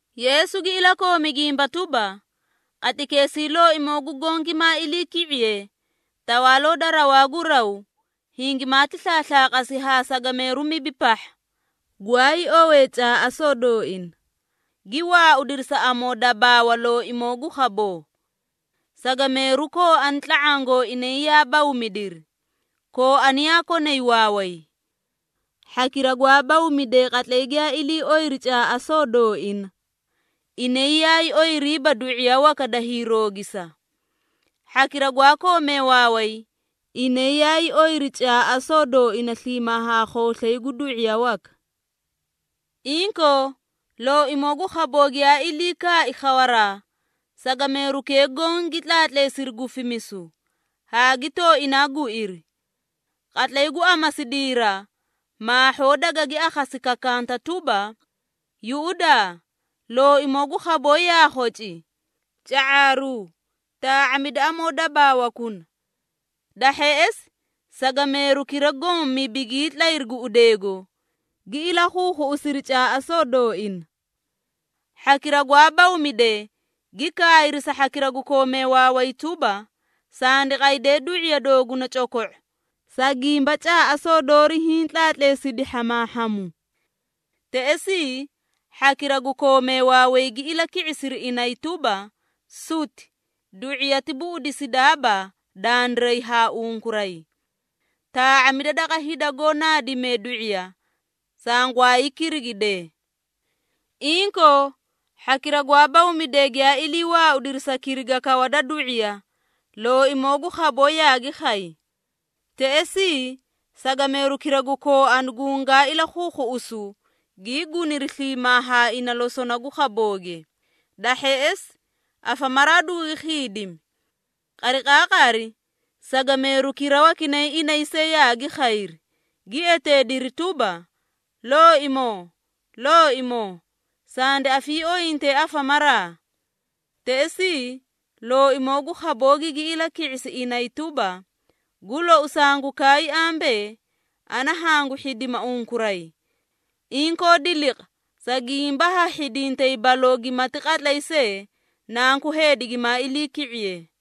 Yeesu gi ilakoomi gimba tuba, “Qatlaykeesii Looimoo gu Goõ gimaa iliiki⁄iye, Tawaaloo da rawaa gu raw, hingimaati slaaslaaqasi haa sagameeru mibi pahha, gwaay owee caaꞌasoo dooina, gi waaudiri sa amoodabaawa looimoo gu khaboo. Sagameeru kooani tla⁄aã gooinay yaa bawmidiri, kooani yaa konay waaway. Hhakira gwaa bawmidee qatlay giyaa ilii oyiri caaꞌasoo dooina, inay yaay oyiriiba du⁄iya waka da hiiroogisa. Hhakira gwaa koomee waaway, inay yaay oyiri caaꞌasoo dooina sliimaa haa khooslay gu du⁄iya waka. Inkoo, looimoo gu khaboo giyaa ilii kaai khawaraa, sagameerukee goõ gi tlaatleesiri gufimisu, haa gi tooinaa guiri. Qatlay gu amasidiira, maahhoo dagagi akhasi kakanta tuba, ‘Yuꞌudaa! Looimoo gu khaboo yaa khoci! Ca⁄aaruu, taa⁄amida amoo dabaawakuna.’ Da hheꞌesi, sagameerukira goõ mibi gii tlayri guꞌudeego, gi ilakhuukhuꞌusiri caaꞌasoo dooina. Hhakira gwaa bawmidee gi kaayri sa hhakira gu koomee waaway tuba, ‘Sandi qaydee du⁄iya dooguna coko⁄o, sa gimba caaꞌasoo doori hiĩ tlaatleesiri hhamaahharu.’ Teꞌesii, hhakira gu koomee waaway gi ilaki⁄isiri inay tuba, ‘Suti, du⁄iyati buꞌudisidaaba dandiray haa unkuray. Taa⁄amida daqa hida goó naadimee du⁄iya, sangwaay kirigidee.’ Inkoo, hhakira gwaa bawmidee giyaa ilii waaudiri sa kiriga kawa da du⁄iya, looimoo gu khaboo yaagi khay. Teꞌesii, sagameerukira gu kooani gungaa ilakhuukhuꞌusu, gii guniri sliimaa haa ina losona gu khabooge, da hheꞌesi afamaraa dugugi khiidimi. Qariqaaqari, sagameerukira wakinay inay see yaagi khayri, gi eteediri tuba, ‘Looimoo, looimoo, sandi afiiooyinte afamaraa!’ Teꞌesii, looimoo gu khaboo gigi ilaki⁄isi inay tuba, ‘Gu lou sangu kaay ambee, ana hangu hhidima unkuray!’ Inkoo diliqa, sa gimba ha hhidintay baloo gimati qatlay see, Nanku Heedi gimaa iliiki⁄iye.”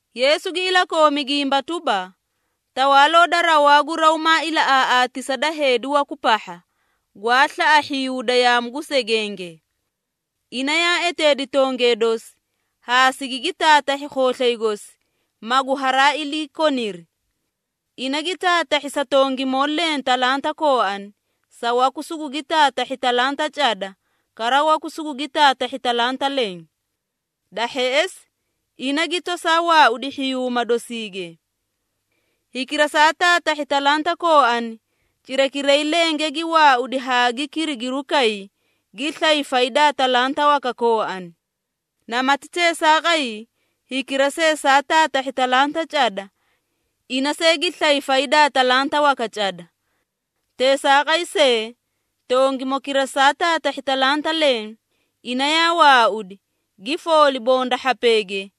Yeesu gi ilakoomi gimba tuba, “Tawaaloo da rawaa gu raw maa ilaꞌaaꞌaatisa da heedi waku pahha, gwaa slaꞌa hhiyuuda yaamu gu segenge. Ina yaa eteedi tongee dosi, haa sigigi taatahhi khooslay gosi, magu haraa iliikoniri. Ina gi taatahhi sa tongimoo leẽ talanta kooani, sa waku sugugi taatahhi talanta cada, kara waku sugugi taatahhi talanta leẽ. Da hheꞌesi, ina gi tosaa waaudi hhiyuuma dosiige. Hikira saa taatahhi talanta kooani, cirakiray lenge gi waaudi haa gi kirigirukay, gi slay faydaa talanta waka kooani. Namati teesaaqay, hikira see saa taatahhi talanta cada, ina see gi slay faydaa talanta waka cada. Teesaaqay see, tongimokira saa taatahhi talanta leẽ, ina yaa waaudi, gi fooli bonda hhapeege,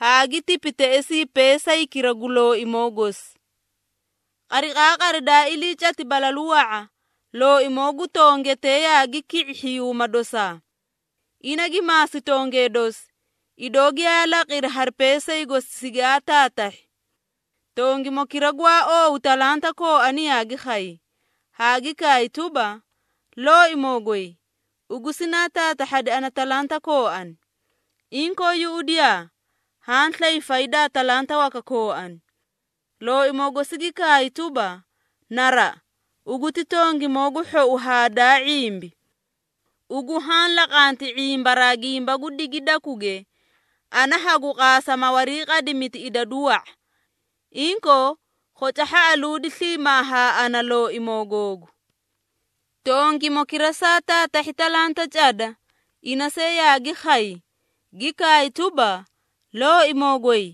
haa gi tipi teꞌesii peesaykira gu looimoo gosi. Qariqaaqari daa ilii cati balalu wa⁄a, looimoo gu tongetee yaagi ki⁄i hhiyuuma dosaa. Ina gi maasi tongee dosi, idoo giyaa laqiri hari peesay gosi sigaa taataahhi. Tongimokira gwaa oowu talanta kooani yaagi khay, haa gi kaay tuba, ‘Looimoo goy, ugu sinaa taatahhadi ana talanta kooani. Inkoo, yuꞌudiyaa haa slay faydaa talanta waka kooani.’ Looimoo gosi gi kaay tuba, ‘Naraꞌa, ugu ti tongimoo gu hhou haa daa ⁄imbi. Ugu haã laqanti ⁄imbaraa gimba gu digidakuge, ana hagu qaasa ma wariiqadimiti idadu wa⁄a. Inkoo, khoca hhaꞌaluudi sliimaa haa ana, looimoo googu.’ Tongimokira saa taatahhi talanta cada, ina see yaagi khay, gi kaay tuba, ‘Looimoo goy,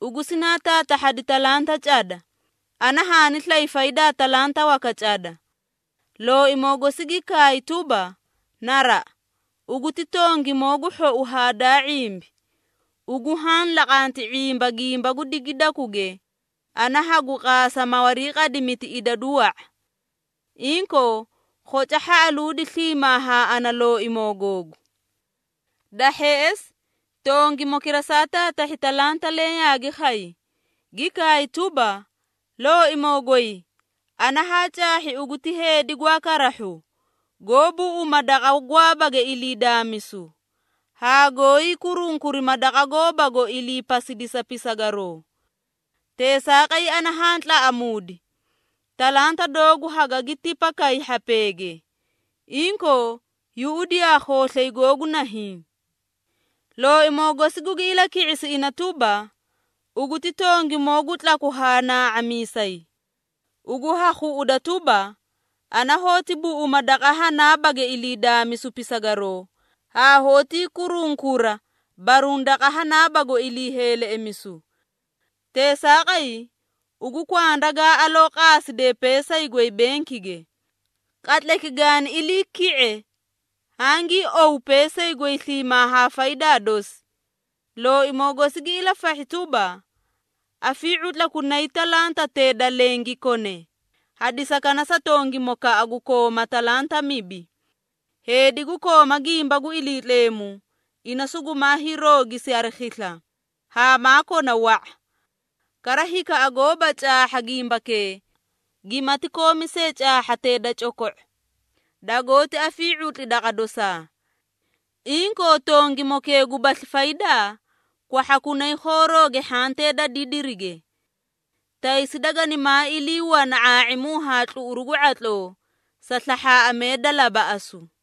ugu sinaa taatahhadi talanta cada, ana haani slay faydaa talanta waka cada.’ Looimoo gosi gi kaay tuba, ‘Naraꞌa, ugu ti tongimoo gu hhou haa daa ⁄imbi. Ugu haã laqanti ⁄imba gimba gu digidakuge, ana hagu qaasa ma wariiqadimiti idadu wa⁄a. Inkoo, khoca hhaꞌaluudi sliimaa haa ana, looimoo googu.’ Da hheꞌesi, tongimokira saa taatahhi talanta leẽ yaagi khay, gi kaay tuba, ‘Looimoo goy, ana haa caahhi ugu ti heedi gwaa karahhu, goó buꞌuma daqa gwaabage ilii daamisu, haa goóyi kurunkurima daqa goobago ilii pasidisa pisagaroo. Teesaaqay ana haa tlaꞌamuudi, talanta doogu hagagi tipakay hhapeege. Inkoo, yuꞌudiyaa khooslay googu nahiĩ.’ Looimoo gosi gugi ilaki⁄isi ina tuba, ‘Ugu ti tongimoo gu tlaku haa naa⁄amiisay! Ugu ha khuꞌuda tuba, ana hoóti buꞌuma daqa hanaabage ilii daamisu pisagaroo, haa hoótii kurunkura baruũ daqa hanaabago ilii heeleꞌemisu! Teesaaqay, ugu kwanda gaa aloo qaaside peesay goy benkige. Qatlayki gaani ilii ki⁄e, hangii owu peesay goy sliimaa haa faydaa dosi.’ Looimoo gosi gi ilafahhi tuba, ‘Afii⁄utlakunayi talantatee da leẽ gi kone, hadisakana sa tongimokaꞌa gu kooma talanta mibi. Heedi gu kooma gimba gu Iliitleemu, ina sugumaa hiiroogisi hari khisla, haa maa kona wa⁄a. Kara hikaꞌa goóba caahha gimbakee, gimati koomi see caahhatee da coko⁄o, dagoóti afii⁄utli daqa dosaa. Inkoo, tongimokee gubasli faydaa, kwahhakunay khoorooge hhantee da didirige. Taysi daganimaa ilii wana ⁄aa⁄imu haa tluꞌuru gu ⁄atloo, sa slahhaaꞌamee da labaꞌasu.’”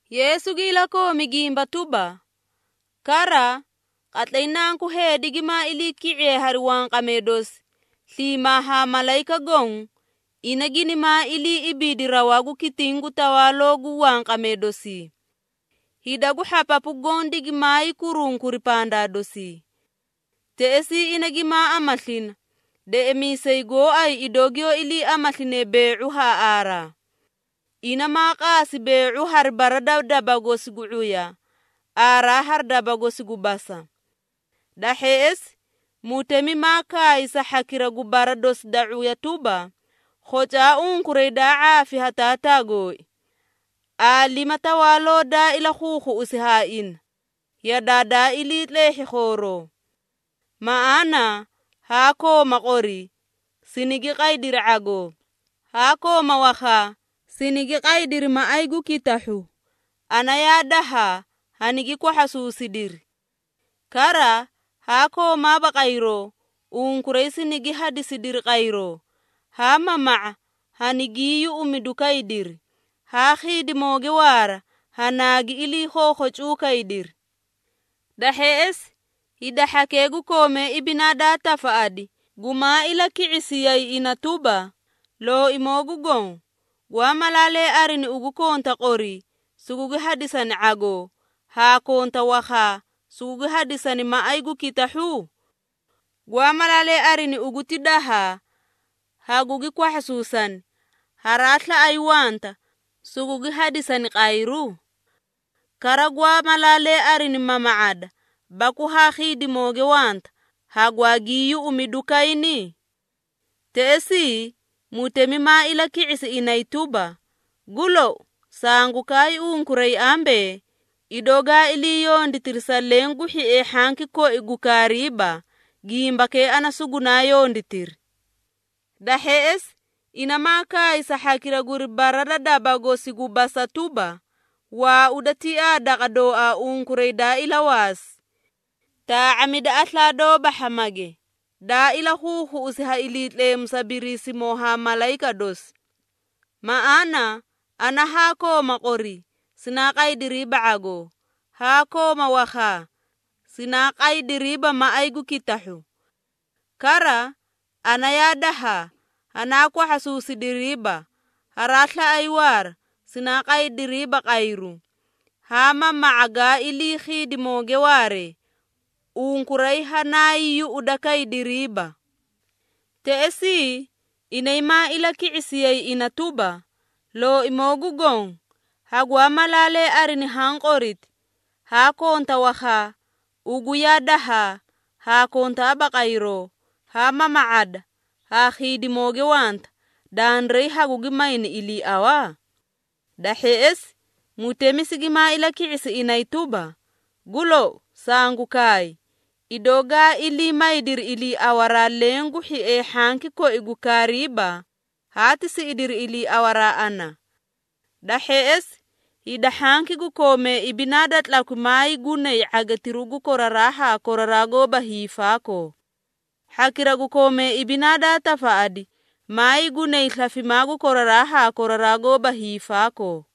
Yeesu gi ilakoomi gimba tuba, “Kara, qatlay Nanku Heedi gimaa iliiki⁄iye hari wanqamee dosi, sliimaa haa malayika goõ, ina ginimaa ilii ibiidi rawaa gu kitiĩ gu tawaalooge gu wanqamee dosii. Hida gu hhapapu goõ digimaay kurunkuri pandaa dosii. Teꞌesii ina gimaa amaslina, deꞌemiisay gooay idoo giyoó iliiamasline bee⁄u haa aaraa. Ina maa qaasi bee⁄u hari bara da daba gosi gu ⁄uya, aaraa hari daba gosi gu basa. Da hheꞌesi, mutemi maa kaay sa hhakira gu bara dosi da ⁄uya tuba, ‘Khocaa unkuray daa ⁄aafi ha Taataa gooi! Aalima tawaaloo daa ilakhuukhuꞌusi ha ina, yadaa daa ilii tleehhi khooroo. Maꞌaana, haa kooma qori, sinigi qaydiri ⁄agoo, haa kooma wakhaa, sinigi qaydiri maꞌay gu kitahhu, ana yaa dahaa, hanigi kwahhasuusidiri. Kara, haa koomaaba qayroo, unkuray sinigi hadisidiri qayroo, haa mama⁄a, hanaagii yuꞌumidukaydiri, haa khiidimooge waara, hanaagi ilakhookhocuu kaydiri.’ Da hheꞌesi, hida hhakee gu koomee ibinaa daa tafaꞌadi, gumaa ilaki⁄isiyay ina tuba, ‘Looimoo gu Goõ, gwaa malaalee arini ugu konta qori, sugugi hadisani ⁄agoo, haa konta wakhaa, sugugi hadisani maꞌay gu kitahhu? Gwaa malaalee arini ugu ti dahaa, hagugi kwahhasuusani, haraa slaꞌay wanta, sugugi hadisani qayru? Kara, gwaa malaalee arini mama⁄ada, baku haa khiidimooge wanta, hagwaagii yuꞌumidu kayni?’ Teꞌesii, mutemi maa ilaki⁄isi inay tuba, ‘Gu lou, sangu kaay unkuray ambee, idoo gaa ilii yonditiri sa leẽ gu hhiee hhanki koi gu kaariiba, gimbakee ana sugunaa yonditiri.’ Da hheꞌesi, ina maa kaay sa hhakira guri bara da daba gosi gu basa tuba, ‘Waauda tiaa daqa dooaa unkuray daa ilawaasi! Taa⁄amida aslaa doóba hhamage, daa ilakhuukhuꞌusi ha Iliitleemu sa Biriisimoo haa malayika dosi. Maꞌaana ana haa kooma qori, sinaa qaydiriiba ⁄agoo, haa kooma wakhaa, sinaa qaydiriiba maꞌay gu kitahhu. Kara, ana yaa dahaa, hanaa kwahhasuusidiriiba, haraa slaꞌay waara, sinaa qaydiriiba qayru, haa mama⁄a gaa ilii khiidimooge waare, unkuray hanaay yuꞌudakaydiriiba.’ Teꞌesii, inay maa ilaki⁄isiyay ina tuba, ‘Looimoo gu Goõ, hagwaa malaalee arini haã qoriti, haa konta wakhaa, ugu yaa dahaa, haa kontaaba qayroo, haa mama⁄ada, haa khiidimooge wanta, dandiray hagugi mayni iliiawa?’ Da hheꞌesi, mutemi sigimaa ilaki⁄isi inay tuba, ‘Gu lou, sangu kaay, idoo gaa ilii maydiri iliiawaraa, leẽ gu hhiee hhanki koi gu kaariiba, haati siꞌidiri iliiawaraa ana.’ Da hheꞌesi, hida hhanki gu koomee ibinaa da tlakwi maay gunay ⁄agitiru gu koraraa haa koraraa goóba hiifaakoo. Hhakira gu koomee ibinaa daa tafaꞌadi, maay gunay slafimaa gu koraraa haa koraraa goóba hiifaakoo.”